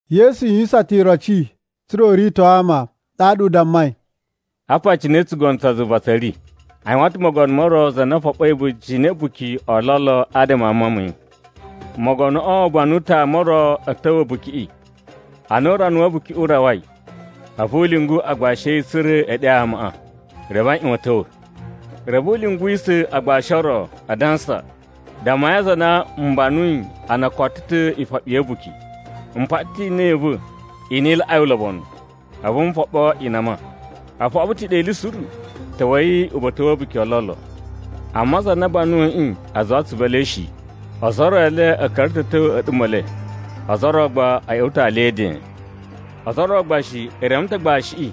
Yesu yuwisan ta̱ iroci tsa̱ra̱ u rito ama. Ɗaɗa u dammai, “Apa cine tsugono tsa zuva tsa̱ ri: A yuwan ta̱ mogono mo ro za na foɓoi a̱ba̱jini a̱ a̱buki o lolo adama a mawun ma̱ yi. Mogonoꞌo u banu ta̱ ama o ro a̱ ta̱wa̱ a̱bukiꞌi. Ana urana wa̱ a̱bukiꞌi u rawai, a̱vu u lyungu agbashi a̱ yi tsa̱ra̱ e ɗe amaꞌa, reve a ꞌyuwan a̱ ta̱wa̱. “Reve u lyunguwisa̱ agbashi o ro, adansa, ‘Dammai aza a na m banuyi a na o koto ta̱ ifoɓi ya̱ a̱buki. M paɗa ta̱ inan i va̱ i na i laꞌai ulobonu, a̱vu n foɓo inama. O foɓo ta̱ ɗe ili suru. Ta̱wa̱i uba̱ta̱ wa̱ a̱buki o lolo.’ “Amma aza a na a banuyiꞌi a zuwa atsuvu e le shi. Ozo o ro e le a̱ ka̱ra̱ ta̱ a̱ tyo a̱ a̱ɗuma̱ e le, ozo o ro gba a̱ ꞌya̱wa̱ ta̱ alya e eden. Ozo o ro gba shi e reme ta̱ agbashiꞌi,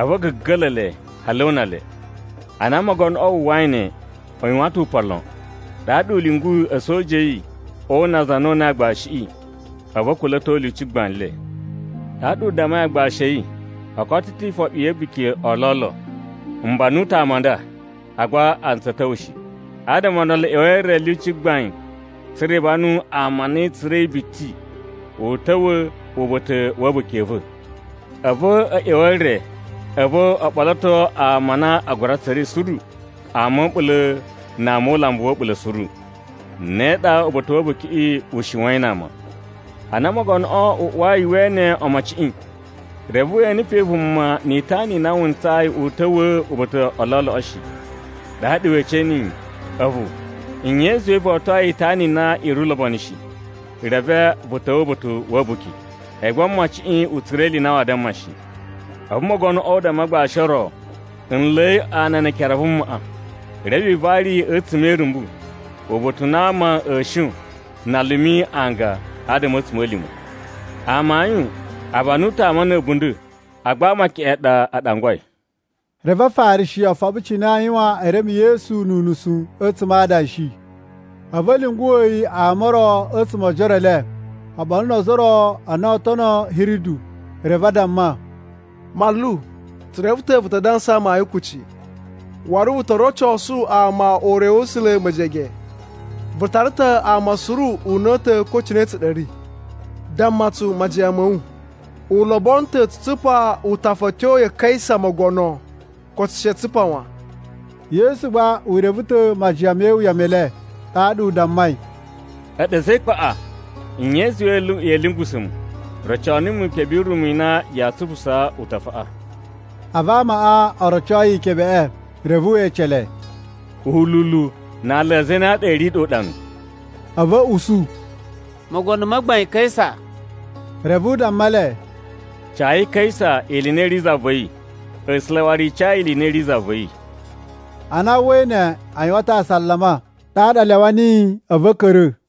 a̱vu a̱ ga̱ga̱la̱ le, hali o una le. Ana mogonoꞌo wu uwwai ne, u yuwan ta̱ upan lon. Ɗaɗa u lyunguyi a̱soja a̱ yi o una aza a na o unai agbashiꞌi, a̱vu a̱ kula̱to lyuci gbain le. “Ɗaɗa u dammai agbashi a̱ yi, ‘O koto ta̱ ifoɓi ya̱ a̱buki o lolo. M banu ta̱ ama a nda, agba a ntsaa a̱ ta̱wa̱ shi. Adama o ndolo, ꞌya̱wa̱i e re lyuci gbaiꞌin tsa̱ra̱ i banu vuma na i tsura̱i biti u ta̱wa̱ uba̱ta̱ wa̱ a̱buki a̱ va̱.’ A̱vu a̱ ꞌya̱wa̱ e re, a̱vu o ɓoloto ama a na a gura tsura̱i suru, ama a̱ a̱ɓula̱ na ama o ulambu wa̱ a̱ɓula̱ suru. Ne ɗa uba̱ta̱ wa̱ a̱bukiꞌi u shiwain na ama. “Ana mogonoꞌo u uwai we ene omociꞌin, reve we ene pe vuma ni itana i na wu ntsayi u ta̱wa̱a̱ uba̱ta̱ u lolo shi. Ɗaɗa we ece niyi, ‘A̱vu, nye i zuwai vo otoi itana i na i ri ulobonu shi, reve vu ta̱wa̱ uba̱ta̱ wa̱ a̱buki?’ A̱yi gba mociꞌin u tsura̱ ili i na waa damma shi. “A̱vu mogonoꞌo u damma agbashi o ro, ‘Nla̱i ana ne ekere a vumaꞌa. Reve i vari yi a̱tsuma̱ e irumbu, uba̱ta̱ u na ama a̱a̱ shon na a lumi anga adama a̱ a̱tsuma̱lima̱.’ “Amayun, a banu ta̱ ama na̱ a̱bunda̱, agba ama keꞌen ɗa a ɗangwai.” Reve Afarishi o foɓo cine aa yuwan e reme Yesu nu unusu a̱tsuma̱ a adanshi. A̱vu a̱ lyunguwa̱ yi ama o ro a̱tsuma̱ o ojoro e le oɓolo no ozo o ro a na oo tono Hiridu. Reve a damma, “Manlu tsu reve ta̱ vu ta dansa amayun kuci, waru vu to rocosu ama ure wa̱ A̱sula̱ mejege. Vu tara ta̱ ama suru una̱ta̱, ko cine tsa ɗa a̱ ri. Damma tsu majiyan ma̱ wu, u lobono ta̱ tsu tsupa utafa a̱ tyo ya Kaisa mogono, ko she tsu tsupa wan?” Yesu gba u reve ta̱ majiyan me iwuya me le, ɗaɗa u dammai, “A̱ɗu a̱za̱ e ikpaꞌa! Nye i zuwai ya̱a̱ lyungusa̱ mu? Roco numu ikebe yi rumu i na yaa tsupusaa utafaꞌa.” A̱vu amaꞌa o roco yi ikebeꞌe. Reve we ece le, “Ululu na aala a zane a ɗa a̱ ri ɗe uɗanu?” A̱vu a̱ usu, “Mogono ma gbain Kaisa.” Reve u damma le, “Cayi Kaisa ili i na i ri za va̱ yi, A̱sula̱ waru i ca yi ili i na i ri za va̱ yi.” Ana a uwwai ne, a yuwan ta̱ asalama, ɗaɗa a lyawa niyi a̱vu a̱ ka̱ra̱.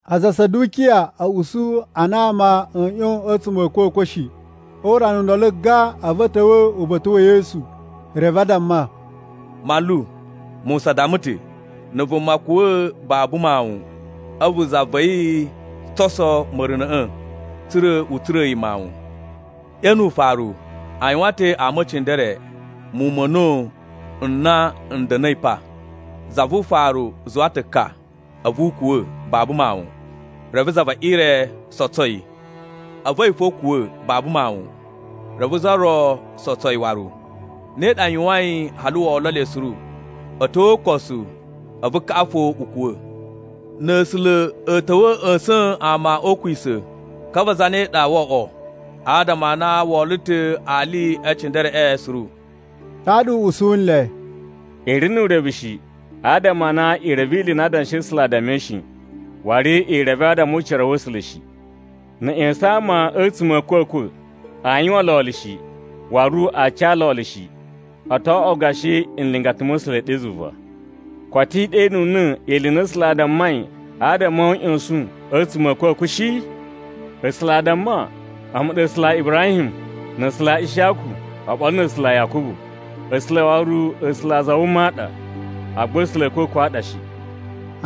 Aza a Sadukiya a̱ usu a na ama a̱a̱ ꞌyon a̱tsuma̱ a̱ a̱kwa̱kwa̱ shi. O urana u ndolo gan, a̱vu a̱ ta̱wa̱ uba̱ta̱ wa̱ Yesu. Reve a damma, “Manlu, Musa damma ta̱, ‘Na̱ vuma kuwa̱ babu mawun, a̱vu za va̱ yi sotso ma̱runa̱ꞌa̱ tsa̱ra̱ u tsura̱a̱ yi mawun.’ Ɗe nu ufaru, a yuwan ta̱ ama e cindere muwun ma̱ a̱na̱wu n na n da̱na̱i pa. Za vu ufaru zuwa ta̱ ka, a̱vu u kuwa̱ babu mawun. Reve za ve ire sotso yi. A̱vu a̱yi fo u kuwa̱ babu mawun, reve za ro sotso yi waru, ne ɗa a yuwain hali wo olo le suru. A̱ tyo o ukosu, a̱vu kaꞌa fo u kuwa̱. Na̱ A̱sula̱ a̱ ta̱wa̱ a̱ ꞌya̱sa̱n ama o ukwisa̱, ka va zane ɗa woo oꞌwo? Adama a na wo olo ta̱ ali e cindereꞌe suru.” Ɗaɗa u usu nle, “I ri nu urevu shi, adama a na i reve ili i na Adanshi a̱ A̱sula̱ a dammai shi, waru i reve adama o ucira wa̱ A̱sula̱ shi. Na̱ a̱ ꞌya̱sa̱n ama a̱tsuma̱ a̱ a̱kwa̱kwa̱, aa yuwan lolo shi, waru aa ca lolo shi. O to oꞌwo gashi nlingata ma̱ A̱sula̱ ɗe zuva. Koto i ɗenuna̱ ili i na A̱sula̱ a dammai adama o uꞌyosun a̱tsuma̱ a̱ a̱kwa̱kwa̱ shi? A̱sula̱ a damma, ‘A̱mu ɗa A̱sula̱ a Ibrahim, na̱ A̱sula̱ a Ishiyaku, oɓolo na̱ A̱sula̱ a Yakubu.’ A̱sula̱ waru A̱sula̱ a aza a wuma a ɗa, agba A̱sula̱ a̱ a̱kwa̱kwa̱ a ɗa shi.”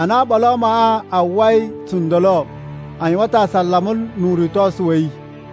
Ana oɓolo a amaꞌa a uwwai tsundolo, a yuwan ta̱ asalama nu uritosu wa̱ yi.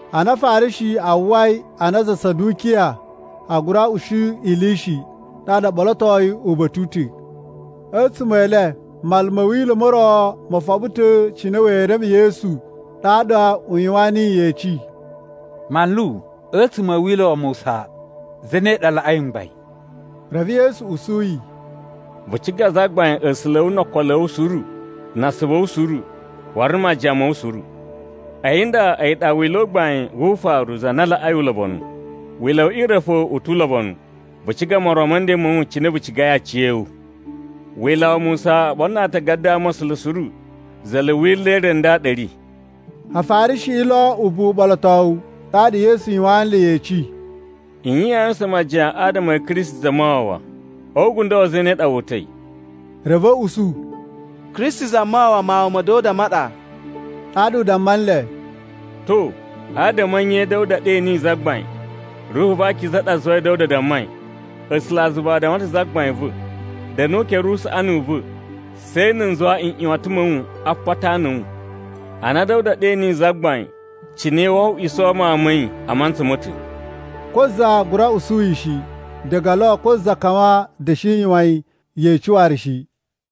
Ana Afarishi a uwwai a na aza a Sadukiya a gura usu ili shi, ɗaɗa o ɓolotoi uba̱ta̱ u ta̱. A̱tsuma̱ e le, manlu ma̱ Wila̱ mo ro mo foɓo ta̱ cine wee reme Yesu ɗaɗa u yuwan niyi yeci: “Manlu, a̱tsuma̱ a̱ Wila̱ wa Musa, zane ɗa laꞌai mgbain?” Reve Yesu usu yi, “ ‘Vu ciga Zagbain A̱sula̱ a̱ wu no okolo a̱ wu suru, na asuvu a̱ wu suru, waru na̱ majiyan ma̱ wu suru.’ A̱yi nda a̱yi ɗa Wila̱ u gbain wu ufaru za na laꞌai ulobonu. Wila̱ we ire fo u tu ulobonu, ‘Vu ciga moron ma̱ nden ma̱ wu cine vu cigai aciya̱wu.’ Wila̱ wa Musa oɓolo na Atagada a Ama̱sula̱ suru za̱la̱ wila̱ re nda ɗa a̱ ri.” Afarishiꞌi lo ubuwu uɓolotowu, ɗaɗa Yesu yuwan nle yeci, “Nye yaa yuwusan majiyan adama a̱ Kristi Zamawawa? O ugundo wa̱ zane ɗa wu uta̱i?” Reve a̱ usu, “Kristi Zamawawa Mawun ma̱ Da̱wuda ma ɗa.” Ɗaɗa u damma nle, “To, adama a̱ nye Da̱wuda ɗe niyi ‘Zagbain?’ Ruhu va Akiza ɗa zuwai Da̱wuda dammai, ‘A̱sulazuva a damma ta̱ Zagbain va̱. Da̱nu o ukere usaꞌani u va̱, she na̱ n zuwa nꞌyuwatan ma̱ wu a apata a ana a̱ wu.’ “Ana Da̱wuda ɗe niyi Zagbain, cine woo oꞌwiso mawun ma̱ yi a mantsa ma̱ ta̱?” Ko za gura usu yi shi. Diga lo ko za kawan da̱shi yuwan yi yeci waru shi.